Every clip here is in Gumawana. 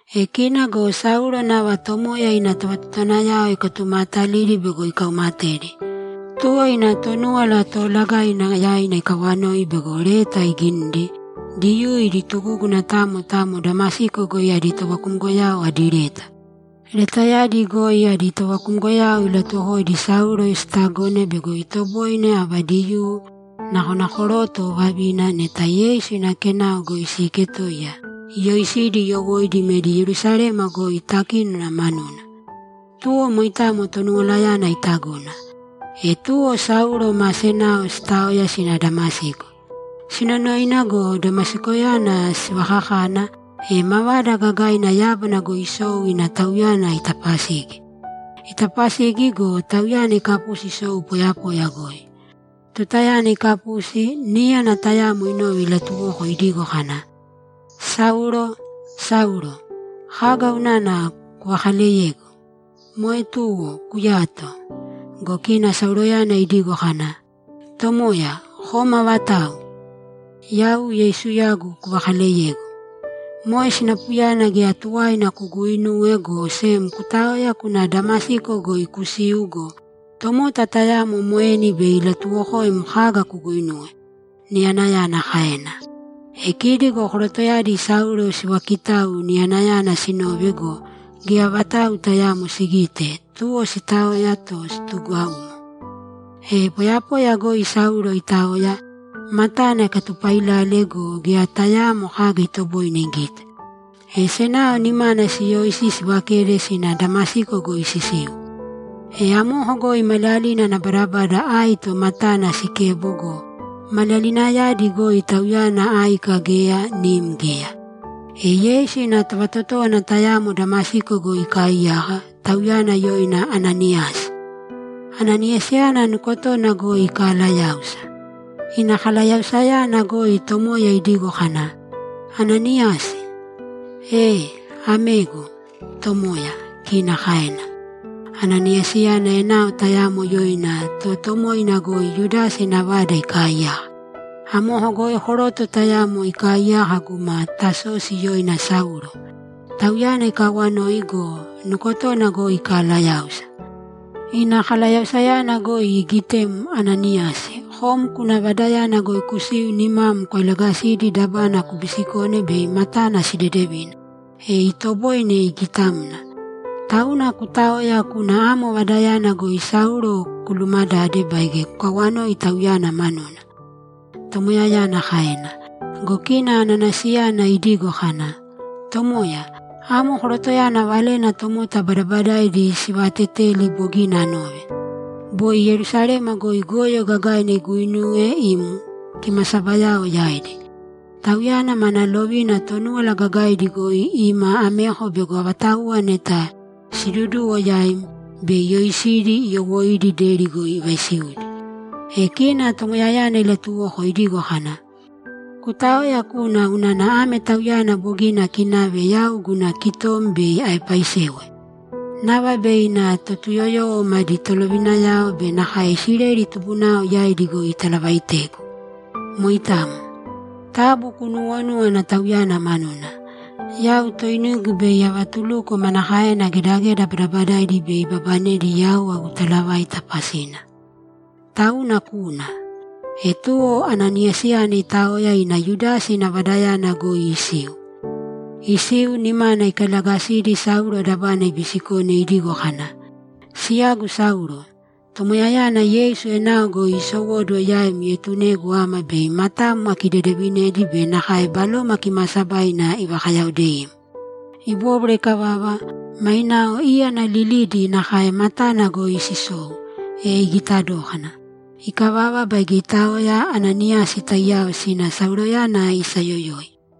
E kina go Saulo nava Tomoya ina tovatotowanayao ikatumaatalidi bego ikaumatedi. Tuwo ina Tonúwala Toolagaina yaina ikawanoi bego leta iginidi, Diyuu idi tugúguna tamo tamo Damasiko goi adi tovakumgoyao adi leta. Letayadi goi adi tovakumgoyao ilatuwokoidi Saulo sitagone bego itoboine ava Diyuu, nakona koroto o vavina, neta Yeisu ina Kenao goi siiketoiya, iyoisidi iyowóidi imedi Yerusalema goi takínona manuna. Tuwo moitamo Tonuwalayana itagona. E tuwo Saulo ma senao sitaoya sina Damasiko. Sinonoina go, Damasikoyana sivakakana, e mavada gagaina yábana goi isou ina tauyana itapasigi. Itapasigi go, tauyana ikapusi isou poyapoya goi. Tutayana ikapusi, níyana tayamo inove ilatuwoko idigo kana, ‘Saulo, Saulo, kaga unana kuvakaleyegu? Moe tuwo kuyāto!’ Go kina Sauloyana idigo kana, ‘Tomoya, kom avatau?’ ‘Yau Yeisuyagu kuvakaaleyegu. Moe sinapuyana geya tuwaina kuguuinūwe, go sem kutāoya kūna Damasiko goi kusīu go, tomota tayamo moeni bei ilatuwokoim kaga kuguinuwe’, niyanayana kaena. E kidi go korotoyadi Saulo sivaakitau niyanayana sinove go, geya vatau tayaamo sigite, tuwo sitaoya to situgaumo. E poyapoya goi Saulo itaoya, matana ikatupailale go, geya tayaamo kaga itoboine igite. E senao nimana siyoisi sivakede sina Damasiko goi sisiu. E amoko goi maliyalina ana badabada aito matana sikebo go, maliyalinayadi goi tauyana áika geya, nim geya. E Yeisu ina tovatotówana tayamo Damasiko goi ikaaiyaka, tauyana yoina Ananiyasi. Ananiyasiyana nukotona goi ikalayáusa. Ina kalayausayana goi Tomoya idigo kana, ‘Ananiyasi.’ ‘Ee, amegu, Tomoya’, kina kaena. ‘Ananiyasi, enao tayamo yoina Totoomoina goi Yudasa ina vada ikaaiyaka. Amoko goi koroto tayamo ikaaiyaka guma Tasosi yoina Saulo. Tauyana ikaawanoi go, nukotona goi ikalayáusa. Ina kalayausayana goi igitem, Ananiyasi, kom kuna vadayana goi kusiu nimam kwailagasidi dabana kubisikone bei matana sidedevina, e itoboine igitamna. Tauna kutāoya kūna amo vadayana goi Saulo kulumadāde baige kukawanōi tauyana manuna’, Tomoyayana kaena. Go kina Ananiyasiyana idigo kana, ‘Tomoya, amo korotoyana valena tomota badabadaidi sivaateteli bogina anove. Boi Yerusalema goi goyo gagaina iguinuwe im kimasabayao yaidi. Tauyana mana lovina Tonúwala Gagaidi goi ima ameko bego avatauwa neta siiduduwo yaim, bei iyoisidi iyowóidi deri goi ivaisiudi.’ E kina Tomoyayana ilatuwoko idigo kana, ‘Kutāoya kūna unana ame tauyana bogina akinave yau guna kitom bei aepaisewe. Nava bei ina Totuyoyowo madi tolovinayao be nakae Isileli tubunao yaidi goi italavaitegu. Moitamo. Taabu kunuuwonūwana tauyana manuna. Yau toinigu bei avatuluko manakaena gedageda badabadaidi bei ibabanedi yau agu talavaita pasina. Tauna kūna.’ E tuwo Ananiyasiyana itaoya ina Yudasa ina vadayana goi isiu. Isiu, nimana ikailagasidi Saulo dabana ibisikone idigo kana, ‘Siyagu Saulo, Tomoyayana Yeisu enao goi iisowóduwo yaim ietunegu ama bei matam akidedevinedi be nakae Baloma Kimaasabaina ivakayaodeim.’ Ibóbwara ikavava, mainao íyana lilidi nakae matana goi sisou, e igita dókana. Ikavava baige itaoya Ananiyasi taiyao sina Sauloyana isayoyoi.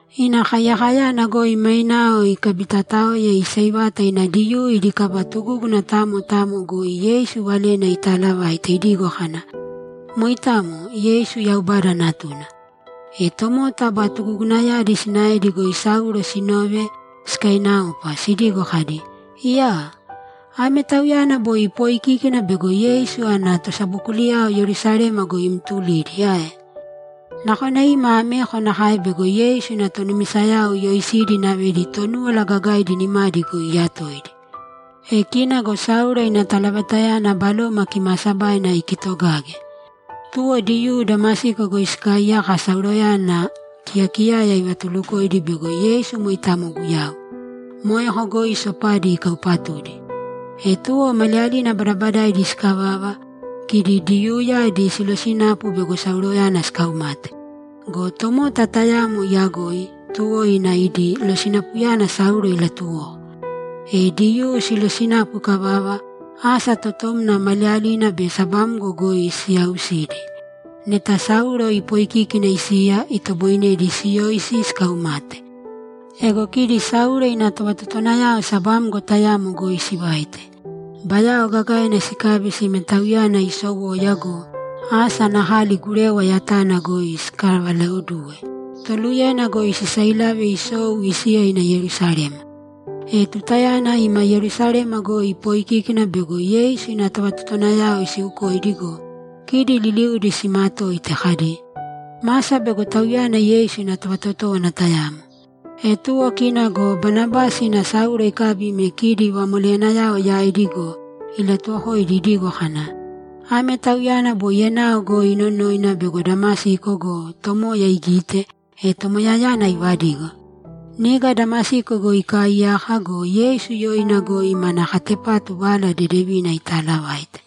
Ina kaiyakayana goi mainao ikabitaotaoya iseivata ina Diyuu idi kaba tugúguna tamo tamo goi Yeisu valena itaalavaite idigo kana, ‘Moitamo, Yeisu Yaubada Natuna.’ E tomota aba tugugunayadi sinaedi goi Saulo sinove sikainaopa, sidigo kadi, ‘Iyaa! Ame tauyana boi ipooikíkina bego Yeisu ana tosabokuliyao Yerusalema goi imtulidi ae? Nakona ima ameko nakae bego Yeisu ina tonumisayao iyoisidi inavedi Tonúwala Gagaidi nimadi goi iyatoidi!’ E kina go Saulo ina talavaitayana Baloma Kimaasabaina ikitogage. Tuwo Diyuu Damasiko goi sikaaiyaka Sauloyana kiyakiyaya ivatulukoidi bego Yeisu moitamo Guyau. Moeko goi sopadi ikaupatudi. E tuwo maliyalina badabadaidi sikavava, kidi Diyuuyadi silosinapu bego Sauloyana sikaumate. Go tomota tayamo iyagoi, tuwo ina idi losinapuyana Saulo ilatuwoko. E Diyuu silosinapu ikavava, asa totomna maliyalina be sabamgo goi siyaausidi. Neta Saulo ipoikíkina isiya, itoboinedi siyoisi sikaumate. Ego kidi Saulo ina tovatotowanayao sabamgo tayamo goi sivaite. Bayao gagaina sikabi sime tauyana isowoya go, asa ana kali gurewa yatana goi sikavalaoduwe, toluye goi sisailave isou isiya ina Yerusalema. E tutayana ima Yerusalema goi ipoikíkina bego Yeisu ina tovatotowanayao isiukoidi go, kidi liliudi simatoite kadi, ‘Masa bego tauyana Yeisu ina tovatotówana tayamo.’ E tuwo kina go Banabasi ina Saulo ikabi ime kidi vamoleyanayao yaidi go, ilatuwokoidi idigo kana, ‘Ame tauyana boi enao goi inonoina bego Damasiko go, Tomoya igite, e Tomoyayana ivadigo. Niga Damasiko goi ikaaiyaka go, Yeisu yoina goi mana katepatu Vala Dedevina italavaite.’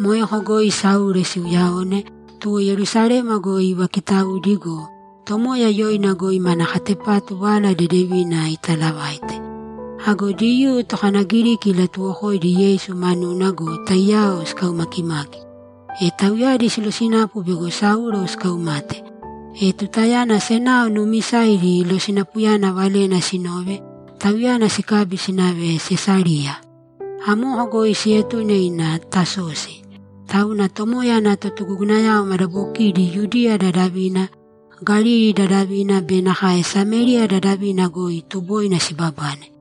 Moeko goi Saulo siuyaone, tuwo Yerusalema goi ivakitaudi go, Tomoya yoina goi mana katepatu Vala Dedevina itaalavaite. Ago Diyuu tokanagiriki ilatuwokoidi Yeisu manuna go, taiyao sikaumakimaki. E tauyadi silosinapu bego Saulo sikaumate. E tutayana senao nuumisaidi losinapuyana valena sinove, tauyana sikabi sinave Sesariya. Amoko goi sietune ina Tasosi. Tauna Tomoya ana totugugunayao madabokidi Yudiya dadavina, Galili dadavina be nakae Samériya dadavina goi tuboina sibabane.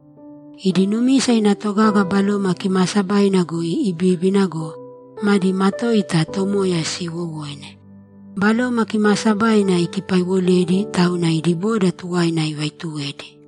Idi numisa ina togaga Baloma Kimaasabaina goi ibibíbina go, madi matoita Tomoya siiwowoine. Baloma Kimaasabaina ikipaiwoledi, tauna idi boda tuwaina ivaituwedi.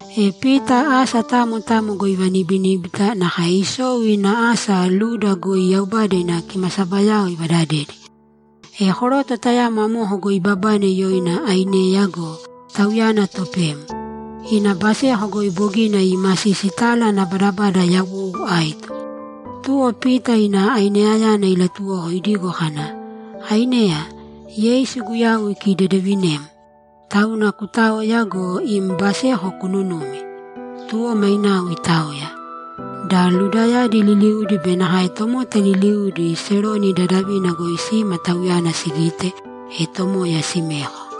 E Pita asa tamo tamo goi ivanibiníbita, nakae isou ina asa Luda goi Yaubada ina kimasabayao ivadadedi. E koroto tayamo amoko goi ibabane yoina Aineya go, tauyana topem; ina baseko goi bogina iimasisi tala ana badabada yawou aito. Tuwo Pita ina Aineyayana ilatuwoko idigo kana, ‘Aineya, Yeisu Guyau ikidedevinem! Tauna kutāoya go, im baseko kununūmi.’ Tuwo mainao itaoya. Da Ludayadi liliudi be nakae tomota liliudi Seroni dadavina goi sima tauyana sigite, e Tomoya simeko.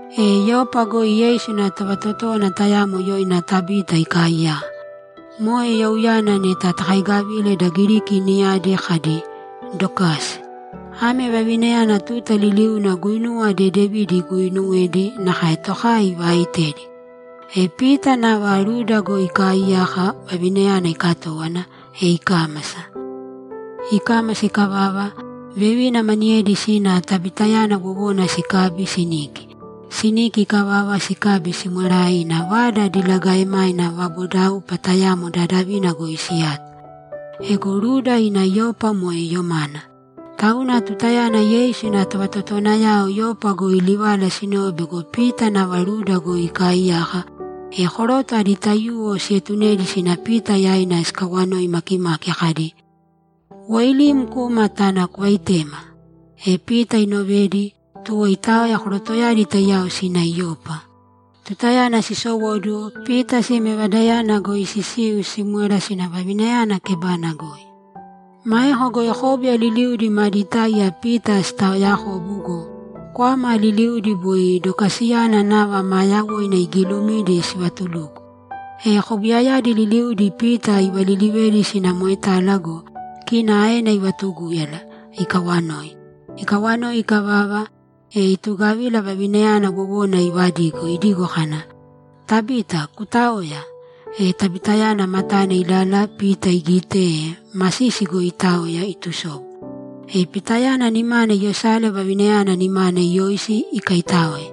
E Yopa goi Yeisu ina tovatotówana tayamo yoina Tabita ikaaiyaka. Moe youyana neta takaigavile da Giriki niyadi kadi, ‘Dokasi.’ Ame vavinayana tuta liliuna guinuwa dedevidi iguuinuwedi, nakae tokai ivaaitedi. E Pita nava Luda goi ikaaiyaka, vavinayana ikatówana, e ikámasa. Ikámasa ikavava, vevina maniyedi sina Tabitayana wowona sikabi siniki. Siniki ikavava, sikabi simwerae ina vada diligaemaina vabodaupa tayamo dadavina goi siyato. Ego Luda ina Yopa moe yomana. Tauna tutayana Yeisu ina tovatotowanayao Yopa goi livala sinove bego Pita nava Luda goi ikaaiyaka, e koroto adi taiyuwo sietunedi sina Pita yaina sikawanoi makimaki kadi, ‘Woilīm kūma tāna kuvaitēma!’ E Pita inovedi, tuwo itaoya korotoyadi taiyao sina Yopa. Tutayana sisowóduwo, Pita sime vadayana goi sisiu simwera sina vavinayana kebana goi. Maeko goi kóbuya liliudi madi táiya Pita sitaoyakobu go, kwama liliudi boi Dokasiyana nava maa yawoina igiilumidi sivatuluko. E kobuyayadi liliudi Pita ivalilivedi sina moetala go, kina aena ivatugúyala, ikawanoi. Ikawanoi ikavava, e itugavila vavinayana wowona ivadigo, idigo kana, ‘Tabita, kutāoya!’ E Tabitayana matana ilala Pita igite, e masisi goi itaoya itusobu. E Pitayana nimana iyosale vavinayana nimana iyoisi, ikaitáoe.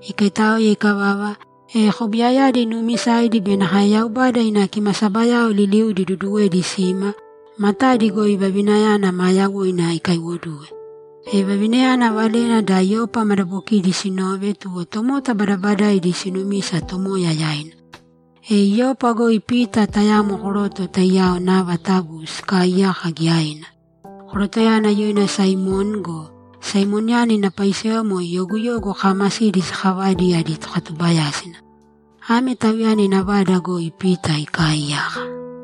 Ikaitáoe ikavava, e kobuyayadi nuumisaidi be nakae Yaubada ina kimasabayao liliudi iduduwedi sima, matadi goi vavinayana maa yawoina ikaiwoduwe. E vavinayana valena da Yopa madabokidi sinove, tuwo tomota badabadaidi sinumisa Tomoya yaina. E Yopa goi Pita tayamo koroto taiyao nava tabu sikaiyaka giyaina. Korotoyana yoina Saimoni go, Saimoniyana ina paisewa moe yoguyogu kaamasidi sakavaidi adi tokatubayásina. Ame tauyana ina vada goi Pita ikaaiyaka.